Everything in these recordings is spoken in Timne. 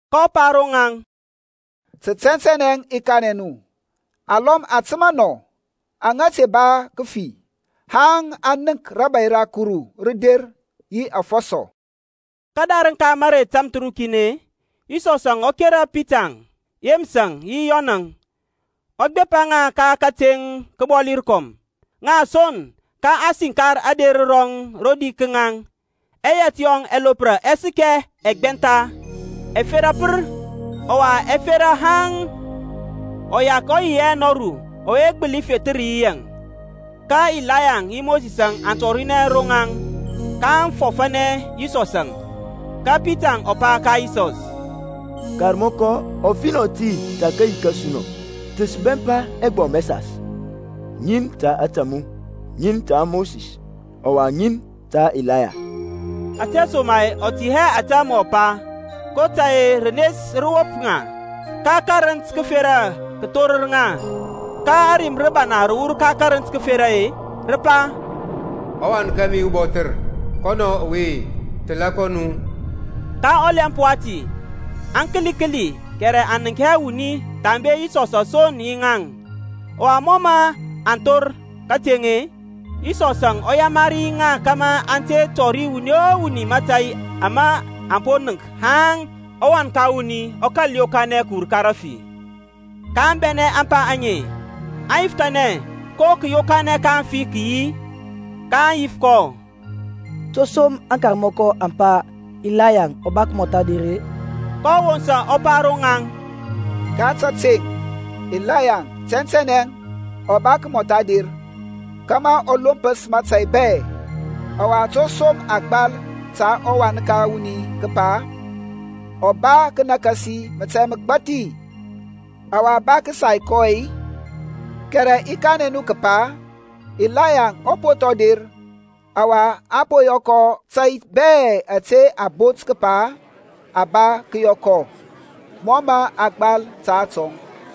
kɔ pa ro ŋaŋ, Tə tɛntɛnɛ i kanɛ nu, alɔm aŋ təmȧ nɔ aŋa ba hɛ kəfi haŋ aŋ nənk rȧbȧy ra Kuru rə der yi afɔsɔ. Kədarəŋ ka mərey tamthərukin-e, Yisɔsȧŋ ɔ kera Pitaŋ, Yeməsȧŋ yi Yɔnȧŋ, ɔ gbepa ŋa ka kəteŋ kəbɔli rəkɔm, ŋa son; ka a siŋkar ader rɔŋ rodi ka ŋaŋ. Ɛyɛt yɔŋ ɛlopra ɛ səkɛ ɛgbɛntha, ɛfera pər, ɔwa ɛ fera haŋ uyak ɔ yi hɛ nɔru ɔwe mə gbəli fethər yi yaŋ. Ka Ilaya yi Mosisȧŋ aŋ tɔrinɛ ro ŋaŋ kaŋ fɔfȧnɛ Yisɔsȧŋ. Ka Pitaŋ ɔ pa ka Yisɔs, Karmɔkɔ, ɔfinɔ ti ta kayi kȧsu nɔ. Ta sə bɛmpa ɛgbɔm ɛsas, ŋin ta ȧtȧ mu, ŋin ta Mosis ɔwa ŋin ta Ilaya. Ȧtesoma-e ɔ tɛ hɛ ȧtȧ mɔ pa, kotȧy-e rənes rə wop ŋa. Ka kərənt kəfera kə thorər ŋa, ka rim rə wur ka karənt kəferȧ-e, rə pa, Ɔwan kȧmi ubɔthər, kɔnɔ ɔwe; təlȧ kɔ nu. Ka ɔlɛmp wati, aŋ kəli kəli kɛrɛ aŋ nənk hɛ wuni thambe Yisɔs son yi ŋaŋ-əŋ. Ɔwa mɔ mə aŋ thor kateŋ-e, Yisɔsȧŋ ɔ yamari ŋa kȧmȧ aŋ te tɔri wuni o wuni mȧtȧy ama aŋ po nənk haŋ ɔWan ka wuni ɔ kȧl yokanɛ kəwur ka aŋfi. kaŋ bɛnɛ ȧŋpa aŋe, aŋ yifəthanɛ ko kȧyokanɛ ka aŋfi kə yi. kaŋ yif kɔ, To som aŋkarmɔkɔ aŋ pa Ilayaŋ ɔ ba kəmɔtha der-e? kɔ wosa ɔ pa ro ŋaŋ, Ka təteŋ Ilayaŋ tɛntɛnɛ ɔ ba kəmɔtha der, kȧmȧ ɔ lompəs mȧtȧy bɛ. Ɔwa to som a gbal ta ɔWan ka wuni kəpa ɔ ba kənakasi mȧtȧy məgbathi, ɔwa a ba kəsay kɔ-e? Kɛrɛ i kanɛ nu kəpa, Ilaya ɔ po thɔŋ der, ɔwa aŋ po yɔ kɔ ȧtȧy bɛ ȧtȧ a bot kəpa a ba kəyɔ kɔ, mɔ mə a gbal ta atɔŋ.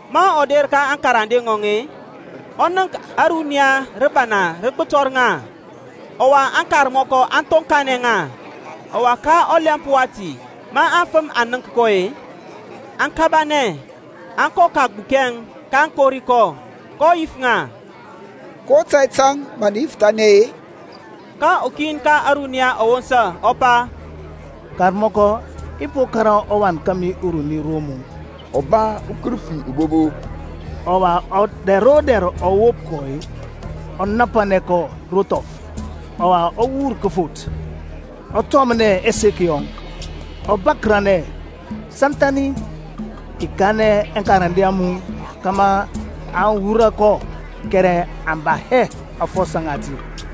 Ma ɔ der ka aŋkarande ŋɔŋ-e, ɔ nənk ȧruniya rəbana rə gbətɔr ŋa, ɔwa aŋkarmɔkɔ aŋ thoŋkanɛ ŋa. Ɔwa ka ɔlɛmp wati ma aŋfəm aŋ nənk kɔ-e, aŋ kabanɛ, aŋ kɔ kəgbukɛŋ, kaŋ kori kɔ. kɔ yif ŋa, Ko tȧy tȧŋ mə nə yifəthanɛ-e? Ka ukin ka ȧruniya ɔ wosa ɔ pa, Karmɔkɔ i po kȧrȧ ɔwan kȧmi uruni ro mu, ɔ ba ukərəfi ubobo, ɔwa dɛr o dɛr ɔ wop kɔ-e, ɔ napanɛ kɔ ro thɔf; ɔwa ɔ wur kəfoth, ɔ tɔmnɛ ɛsek yɔŋ, ɔ bȧkərȧnɛ santhȧni. I kanɛ aŋkarande a mu kȧmȧ aŋ wurɔ kɔ, kɛrɛ aŋ ba hɛ aŋfɔsɔ ŋati.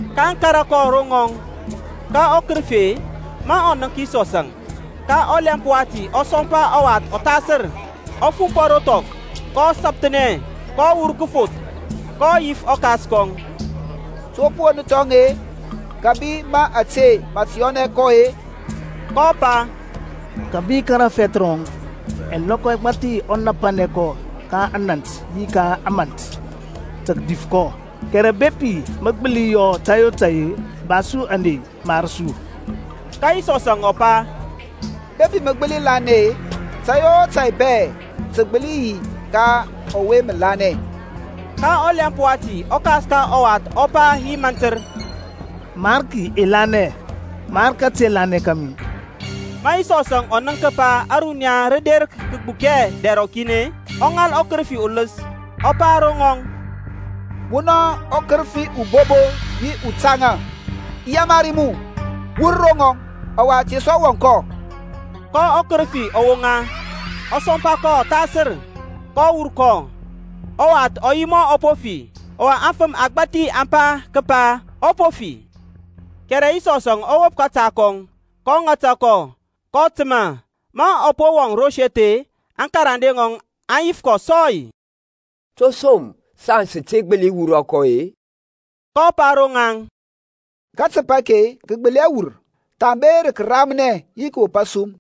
kaŋ kȧrȧ kɔ ro ŋɔŋ, ka ɔkərəfi-e, ma ɔ nənk Yisɔsȧŋ, ka ɔlɛmp wati ɔ sɔmpa ɔwath ɔthasər, ɔ fumpɔ ro thɔf, ɔ sapəthnɛ kɔ wur kəfoth. kɔ yif ɔkas kɔŋ, To pə won thɔŋ-e, kȧbi ma ȧte mə tə yɔnɛ kɔ-e? kɔ pa Kəbi ka rafɛth rɔŋ. Ɛlɔkɔ ɛgbathi ɔ napanɛ kɔ ka anȧnt yi ka ȧmȧnt tə kədif kɔ, kɛrɛ bepi mə gbəli yɔ tȧy o tai-e, ba su ȧney, mar su. Ka Yisɔsȧŋ ɔ pa, Bepi mə gbəli lanɛ-e, tȧy o tȧy bɛ tə gbəli yi ka ɔwe mə lanɛ. Ka ɔlɛmp wati ɔkas ka ɔwath ɔ pa yi mantər, Mariki i lanɛ; mar kate lanɛ kȧmi. Ma Yisɔsȧŋ ɔ nənk kəpa ȧruniya rə der kəgbukɛ dɛr rɔkin-e, ɔ ŋal ɔkərəfi uləs, ɔ pa ro ŋɔŋ Munɔ ukərəfi ubobo yi utaŋa, i yamari mu, wur ro ŋɔŋ, ɔwa te sɔ wɔŋ kɔ. Ka ɔkərəfi ɔ woŋa, ɔ sɔmpa kɔ ɔthasər, kɔ wur kɔ. Ɔwath ɔ yi mɔ ɔ po fi, ɔwa afəm agbȧthi aŋ pa kəpa ɔ po fi. Kɛrɛ Yisɔsȧŋ ɔ wop kȧta kɔŋ, ɔ ŋata kɔ, kɔ təmȧ. Ma ɔ wɔŋ ro seth-e, aŋkarande ŋɔŋ aŋ yif kɔ sɔy, To som saŋ sə te gbəli wurɔ kɔ-e? kɔ pa ro ŋaŋ, Katəp ake kə gbəli hɛ wur, thambe rə kəramnɛ yi kəwop asum.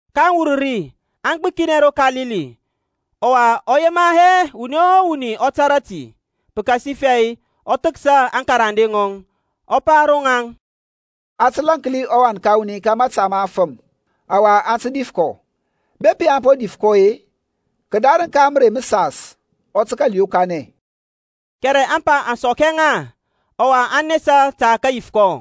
kaŋ wur ri, aŋ gbəkinɛ ro Kalili. Ɔwa ɔ yema hɛ wuni o wuni ɔ tȧrȧ ti. Pəkasifɛ ɔ thəksa aŋkarande ŋɔŋ, ɔ pa ro ŋaŋ, A tə lȧnki ɔWan ka wuni ka mȧta ma aŋfəm, ka aŋ tə dif kɔ; bepi a po dif kɔ-e, kədarəŋ ka mərey məsas ɔ tə kȧl yokanɛ. Kɛrɛ ȧŋpa aŋ sɔk hɛ ŋa, ɔwa aŋ nesa tə kəyif kɔ.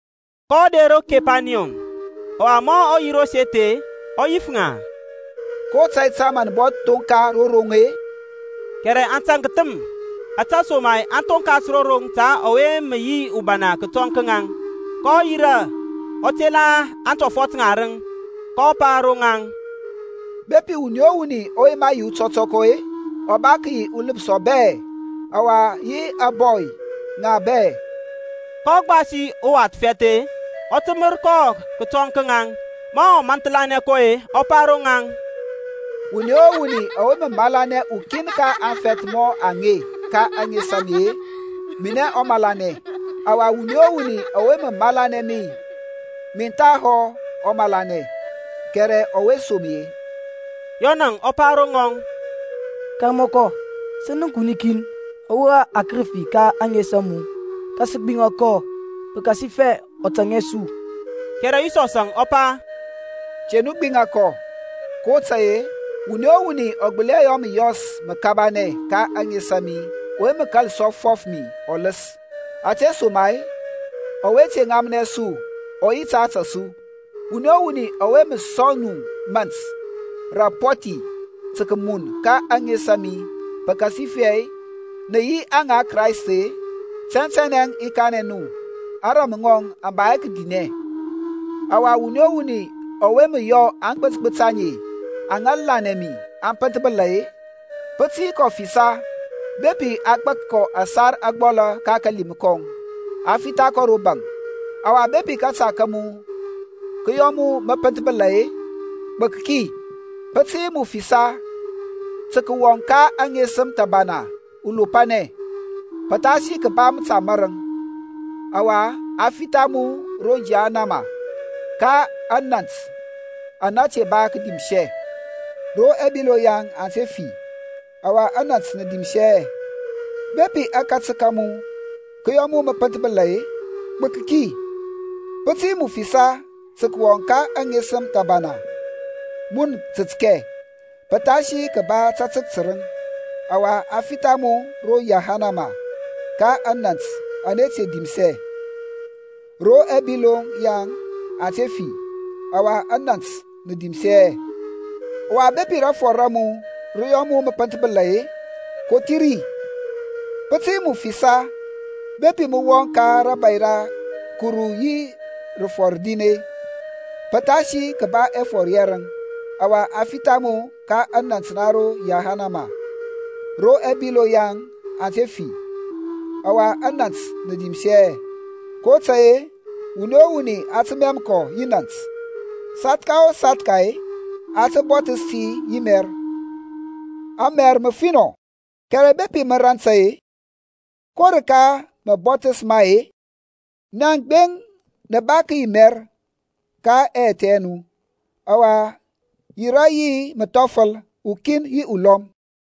Kɔ der ro Kepaniyɔm; ɔwa ma ɔ yi ro seth-e, ɔ yif ŋa, Ko tȧy tȧŋ mə nə bɔ thoŋka ro roŋ-e? Kɛrɛ aŋ taŋk thəm, ȧtesoma-e aŋ thonkas ro roŋ ta ɔwe mə yi ubana kətɔŋ ka ŋaŋ. kɔ yirȧ ɔ tela aŋtɔfɔt ŋarəŋ, kɔ pa ro ŋaŋ, Bepi wuni o wuni ɔ yema yi utɔtɔkɔ-e, ɔ ba kəyi ɔləpsɔ bɛ, ɔwa yi ȧŋbɔy ŋa bɛ. kɔ gbasi uwath fɛth-e, ɔ təmər kɔ kətɔŋ ka ŋaŋ. Ma ɔ manthlanɛ kɔ-e, ɔ pa ro ŋaŋ, Wuni o wuni ɔwe mə malanɛ ukin ka aŋfɛth mɔ ɔwe ka ȧŋes a mi-e, minɛ ɔ malanɛ; ɔwa wuni o wuni ɔwe mə malanɛ mi, min thahɔ ɔ malanɛ, kɛrɛ ɔwe som mi-e. Yɔnȧŋ ɔ pa ro ŋɔŋ, Karmɔkɔ, sə nənk wuni kin ɔ wurɔ akərəfi ka ȧŋes a mu, ka sə gbiŋa kɔ ti pəkasifɛ ɔ tȧŋ hɛ su. Kɛrɛ Yisɔsȧŋ ɔ pa, Te nu gbiŋa kɔ, kotȧy-e wuni o wuni ɔ gbəli hɛ yɔ məyɔs məbana ka ȧŋes a mi ɔwe mə kȧl sɔ fɔf mi ɔləs. Ȧtesoma-e ɔwe te ŋamnɛ su ɔ yi ta ȧtȧ su. Wuni o wuni ɔwe mə sɔŋ nu mȧnt rə apɔthi tə kəmun ka ȧŋes a mi pəkasifɛ nə yi aŋa Kraist-e, tɛntɛnɛ i kanɛ nu ȧŋrȧm ŋɔŋ aŋ ba hɛ kədinɛ. Ɔwa wuni o wuni ɔwe mə yɔ aŋgbət gbət aŋe aŋa lanɛ mi aŋ pənthbəla-e, pə tə yi kɔ ɔfisa bepi a gbak kɔ ȧsar ȧgbɔlȧ ka kalim kɔŋ, a fitha kɔ ro baŋ. Ɔwa bepi kȧta ka mu kə yɔ mu mə pənthbəla-e, gbək ki, pə tə yi mu fisa tə kəwɔŋ ka aŋesəm thəbana ulopanɛ, pəthasi kəba məta mȧrəŋ, ɔwa a fitha mu ro yahanama, ka anant ana te dimsɛ. ro ɛbiloŋ yaŋ aŋ te fi, ɔwa anant nə dimsi hɛ. Bepi akatək ka mu kə yɔ mu mə pənthbəla-e, gbək ki, pə tə yi mu fisa tə kəwɔŋ ka aŋesəm thəbana mun tətkɛ, pəthasi kəba tatək tərəŋ, ɔwa a fitha mu ro yahanama ka anant ana te dimsɛ, ro ɛbiloŋ yaŋ aŋ te fi, ɔwa anant nə dimsɛ hɛ. Ɔwa bepi rafɔr ra mu rə yɔ mu mə pənthbəla-e, kothi ri; pə tə yi mu fisa bepi mə wɔŋ ka rȧbȧy ra Kuru yi rəfɔr rin-e, pəthasi kəba ɛfɔr yɛrəŋ, ɔwa a fitha mu ka anant na ro yahanama, ro ɛbiloŋ yaŋ aŋ te fi, ɔwa anant nə dimsɛ hɛ. kotȧy-e, wuni o wuni a tə mɛm kɔ yi nȧnt, sathka o sathka-e, a tə bɔthəs ti yi mɛr. Amɛr mə finɔ, kɛrɛ bepi mə rant-e, ko rəka rə mə bɔthəs ma-e? Nia gbeŋ nə ba kəyi mɛr ka ɛyɛthɛ nu, ɔwa yirȧ yi məthɔfəl ukin yi ulɔm.